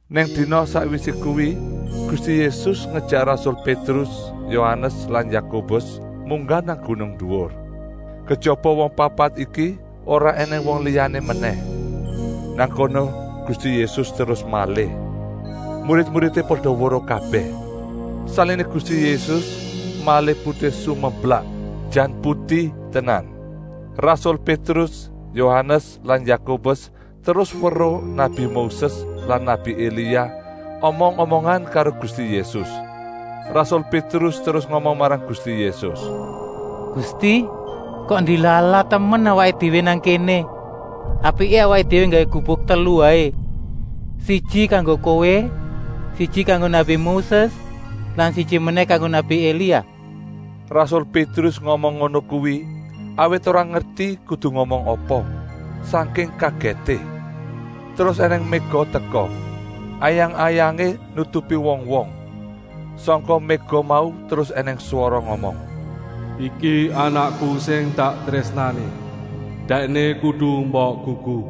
Nem dina sakwisé kuwi Gusti Yésus ngejèk rasul Pétrus, Yohanes lan Yakobus munggah nang gunung duwur. Kejaba wong papat iki ora ènèng wong liyané menèh. Nang kono Gusti Yésus terus malih. Murid-muridé pada weruh kabèh. Saliné Gusti Yésus malih putih sumeblak, jan puti tenan. Rasul Pétrus, Yohanes lan Yakobus terus weruh nabi Moses lan nabi Elia omong-omongan karo Gusti Yésus. Rasul Pétrus terus ngomong marang Gusti Yésus: “Gusti, kok ndilalah temen awaké déwé nang kéné. Apiké awaké déwé nggawé gubuk telu waé, siji kanggo Kowé, siji kanggo nabi Moses lan siji menèh kanggo nabi Elia.” Rasul Pétrus ngomong ngono kuwi, awit ora ngerti kudu ngomong apa, sangking kagèté. Terus ènèng méga teka, ayang-ayangé nutupi wong-wong. Sangka méga mau terus ènèng swara ngomong: “Iki Anakku sing tak trésnani. Dèkné kudu mbok gugu.”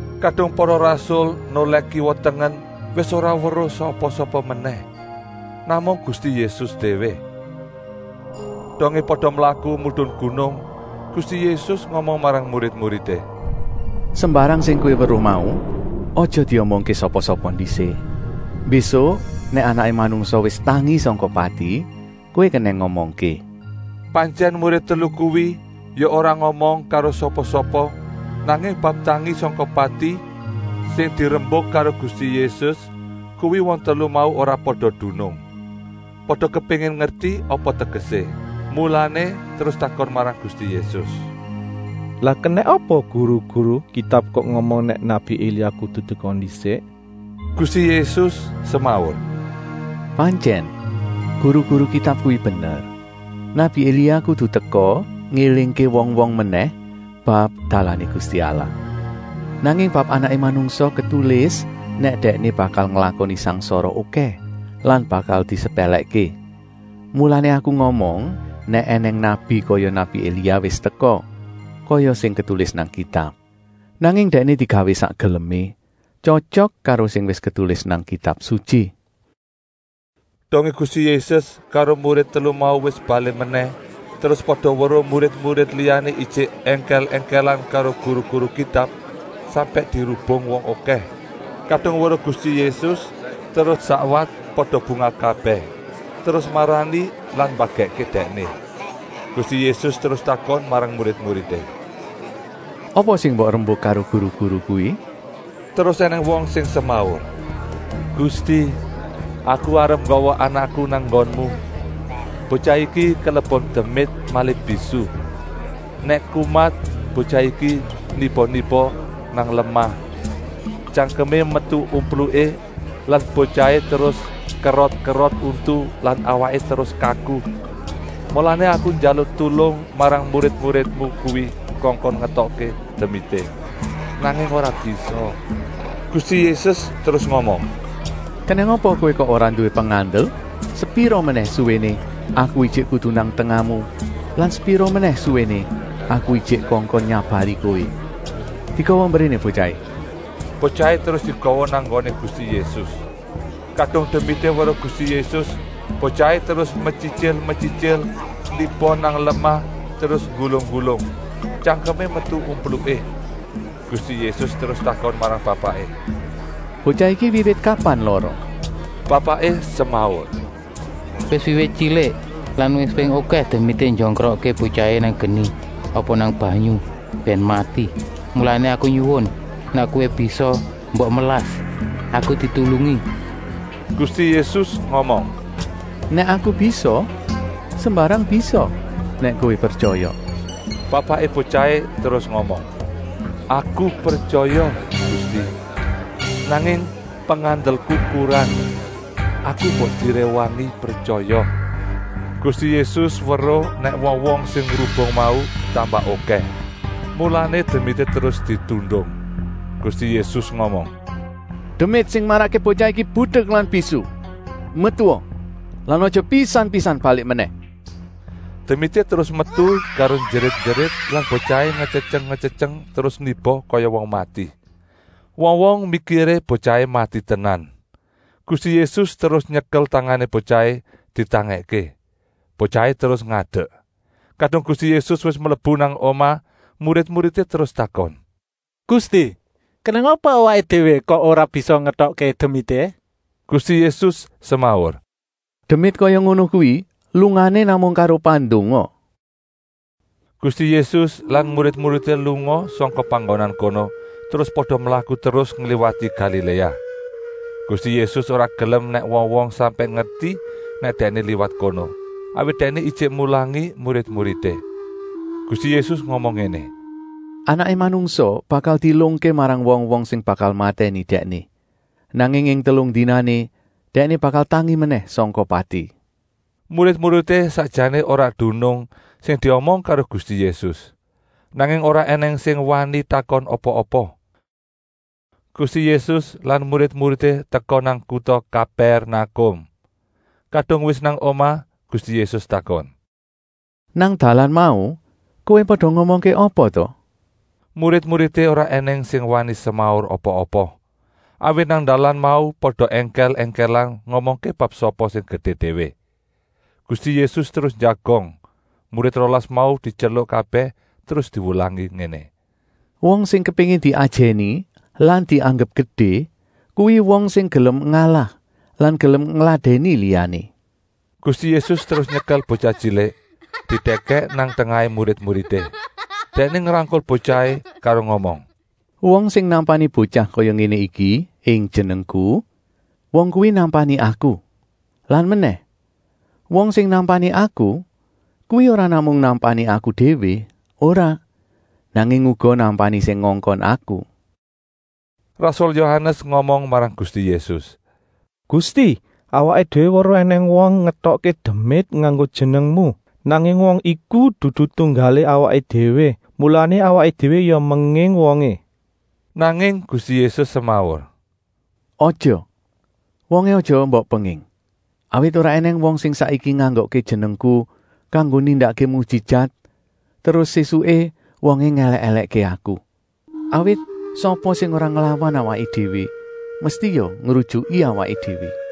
Kadung para rasul nolèh kiwa-tengen wis ora weruh sapa-sapa menèh, namung Gusti Yésus déwé. Dongé pada mlaku medun gunung, Gusti Yésus ngomong marang murid-muridé: “Sembarang sing kowé weruh mau aja diomongké sapa-sapa ndisik. Mbésuk nèk Anaké Manungsa wis tangi sangka pati kowé kenèng ngomongké.” Pantyèn murid telu kuwi ya ora ngomong karo sapa-sapa, nanging bab “tangi sangka pati” sing dirembuk karo Gusti Yésus kuwi wong telu mau ora pada dunung. Pada kepéngin ngerti apa tegesé. Mulané terus takon marang Gusti Yésus: “Lah kenèng apa guru-guru Kitab kok ngomong nèk nabi Elia kudu teka ndisik?” Gusti Yésus semaur: “Pantyèn, guru-guru Kitab kuwi bener. Nabi Elia kudu teka ngélingké wong-wong menèh bab dalané Gusti Allah. Nanging bab Anaké Manungsa ketulis nèk Dèkné bakal nglakoni sangsara okèh lan bakal disepèlèkké. Mulané Aku ngomong nèk ènèng nabi kaya nabi Elia wis teka, kaya sing ketulis nang Kitab. Nanging dèkné digawé sak gelemé, tyotyok karo sing wis ketulis nang Kitab Sutyi.” Dongé Gusti Yésus karo murid telu mau wis balik menèh, terus pada weruh murid-murid liyané ijik èngkèl-èngkèlan karo guru-guru Kitab, sampèk dirubung wong okèh. Kadung weruh Gusti Yésus terus sakwat pada bungah kabèh, terus marani lan mbagèkké Dèkné. Gusti Yésus terus takon marang murid-muridé: “Apa sing mbok rembuk karo guru-guru kuwi?” Terus ènèng wong sing semaur: “Gusti, aku arep nggawa anakku nang nggonmu. Botyah iki kelebon demit malih bisu. Nèk kumat botyah iki niba-niba nang lemah. Tyangkemé metu umpluké lan botyahé terus kerot-kerot untu lan awaké terus kaku. Mulané aku njaluk tulung marang murid-muridmu kuwi kongkon ngetokké demité, nanging ora bisa.” Gusti Yésus terus ngomong: “Kenèng apa kowé kok ora nduwé pengandel? Sepira menèh suwéné Aku ijik kudu nang tengahmu lan sepira menèh suwéné Aku ijik kongkon nyabari kowé? Digawa mbréné botyahé!” Botyahé terus digawa nang nggoné Gusti Yésus. Kadung demité weruh Gusti Yésus, botyahé terus metyityil-metyityil niba nang lemah terus nggulung-nggulung tyangkemé metu umpluké. Gusti Yésus terus takon marang bapaké: “Botyah iki wiwit kapan lara?” Bapaké semaur: “Wis wiwit tyilik! Lan wis ping okèh demité njongkrokké botyahé nang geni apa nang mbanyu bèn mati. Mulané aku nyuwun, nèk Kowé bisa, mbok melas, aku ditulungi!” Gusti Yésus ngomong: “Nèk Aku bisa? Sembarang bisa nèk kowé pretyaya!” Bapaké botyahé terus ngomong: “Aku pretyaya, Gusti! Nanging pengandelku kurang. Aku mbok diréwangi pretyaya!” Gusti Yésus weruh nèk wong-wong sing ngrubung mau tambah okèh, mulané demité terus ditundung. Gusti Yésus ngomong: “Demit sing marakké botyah iki budek lan bisu, metua lan aja pisan-pisan balik menèh!” Demité terus metu karo njerit-njerit lan botyahé ngetyetyeng-ngetyetyeng terus niba kaya wong mati. Wong-wong mikiré botyahé mati tenan. Gusti Yésus terus nyekel tangané botyahé ditangèkké. Botyahé terus ngadek. Kadung Gusti Yésus wis mlebu nang omah murid-muridé terus takon: “Gusti, kenèng apa awaké déwé kok ora bisa ngetokké demité?” Gusti Yésus semaur: “Demit kaya ngono kuwi lungané namung karo pandonga!” Gusti Yésus lan murid-muridé lunga sangka panggonan kono terus pada mlaku terus ngliwati Galiléa. Gusti Yésus ora gelem nèk wong-wong sampèk ngerti nèk Dèkné liwat kono, awit Dèkné ijik mulangi murid-muridé. Gusti Yésus ngomong ngéné: “Anaké Manungsa bakal dielungké marang wong-wong sing bakal matèni Dèkné. Nanging ing telung dinané Dèkné bakal tangi menèh sangka pati.” Murid-muridé sakjané ora dunung sing diomong karo Gusti Yésus, nanging ora ènèng sing wani takon apa-apa. Gusti Yésus lan murid-muridé teka nang kuta Kapèrnakum. Kadung wis nang omah Gusti Yésus takon: “Nang dalan mau kowé pada ngomongké apa ta?” Murid-muridé ora ènèng sing wani semaur apa-apa, awit nang dalan mau pada èngkèl-èngkèlan ngomongké bab sapa sing gedé déwé. Gusti Yésus terus njagong, murid rolas mau dityeluk kabèh terus diwulangi ngéné: “Wong sing kepéngin diajèni lan dianggep gedé kuwi wong sing gelem ngalah lan gelem ngladèni liyané!” Gusti Yésus terus nyekel botyah tyilik didèkèk nang tengahé murid-muridé. Dèkné ngrangkul botyahé karo ngomong: “Wong sing nampani botyah kaya ngéné iki ing jenengku, wong kuwi nampani Aku. Lan menèh, wong sing nampani Aku kuwi ora namung nampani Aku déwé, ora, nanging uga nampani sing ngongkon Aku.” Rasul Yohanes ngomong marang Gusti Yésus: “Gusti, awaké déwé weruh ènèng wong ngetokké demit nganggo jenengmu. Nanging wong iku dudu tunggalé awaké déwé, mulané awaké déwé ya menging wongé.” Nanging Gusti Yésus semaur: “Aja, wongé aja mbok penging. Awit ora ènèng wong sing saiki nganggokké jenengku kanggo nindakké mujijat terus sésuké wongé ngèlèk-èlèkké Aku. Awit sapa sing ora nglawan awaké déwé mesti ya ngrujuki awaké déwé.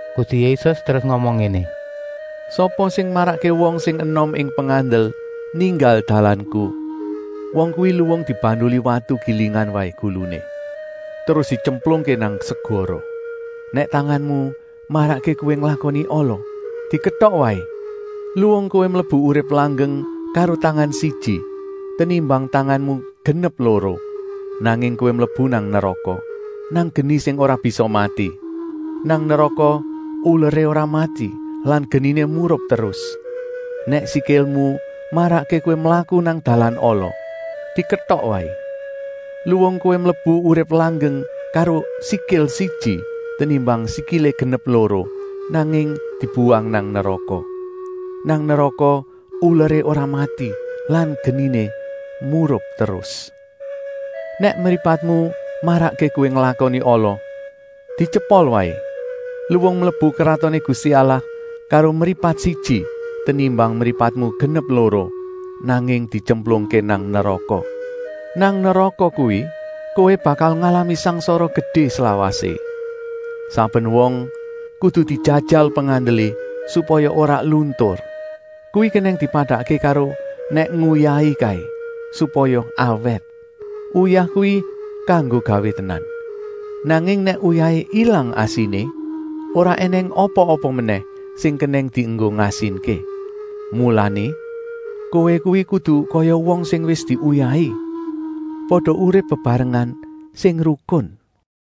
Gusti Yésus terus ngomong ngéné: “Sapa sing marakké wong sing enom ing pengandel ninggal dalanku, wong kuwi luwung dibanduli watu gilingan waé guluné, terus dityemplungké nang segara. Nèk tanganmu marakké kowé nglakoni ala, diketok waé. Luwung kowé mlebu urip langgeng karo tangan siji, tenimbang tanganmu genep loro, nanging kowé mlebu nang neraka, nang geni sing ora bisa mati. ( Nang neraka uleré ora mati lan geniné murup terus.) Nèk sikilmu marakké kowé mlaku nang dalan ala, diketok waé. Luwung kowé mlebu urip langgeng karo sikil siji, tenimbang sikilé genep loro, nanging dibuwang nang neraka. ( Nang neraka uleré ora mati lan geniné murup terus.) Nèk mripatmu marakké kowé nglakoni ala, dityepol waé. Luwung mlebu Kratoné Gusti Allah karo mripat siji, tenimbang mripatmu genep loro, nanging dityemplungké nang neraka. Nang neraka kuwi kowé bakal ngalami sangsara gedé slawasé. “Saben wong kudu dijajal pengandelé supaya ora luntur. Kuwi kenèng dipadakké karo nèk nguyahi kaé, supaya awèt. “Uyah kuwi kanggo gawé tenan. Nanging nèk uyahé ilang asiné, ora ènèng apa-apa menèh sing kenèng dienggo ngasinké? “Mulané, kowé kuwi kudu kaya wong sing wis diuyahi. Pada urip bebarengan sing rukun.”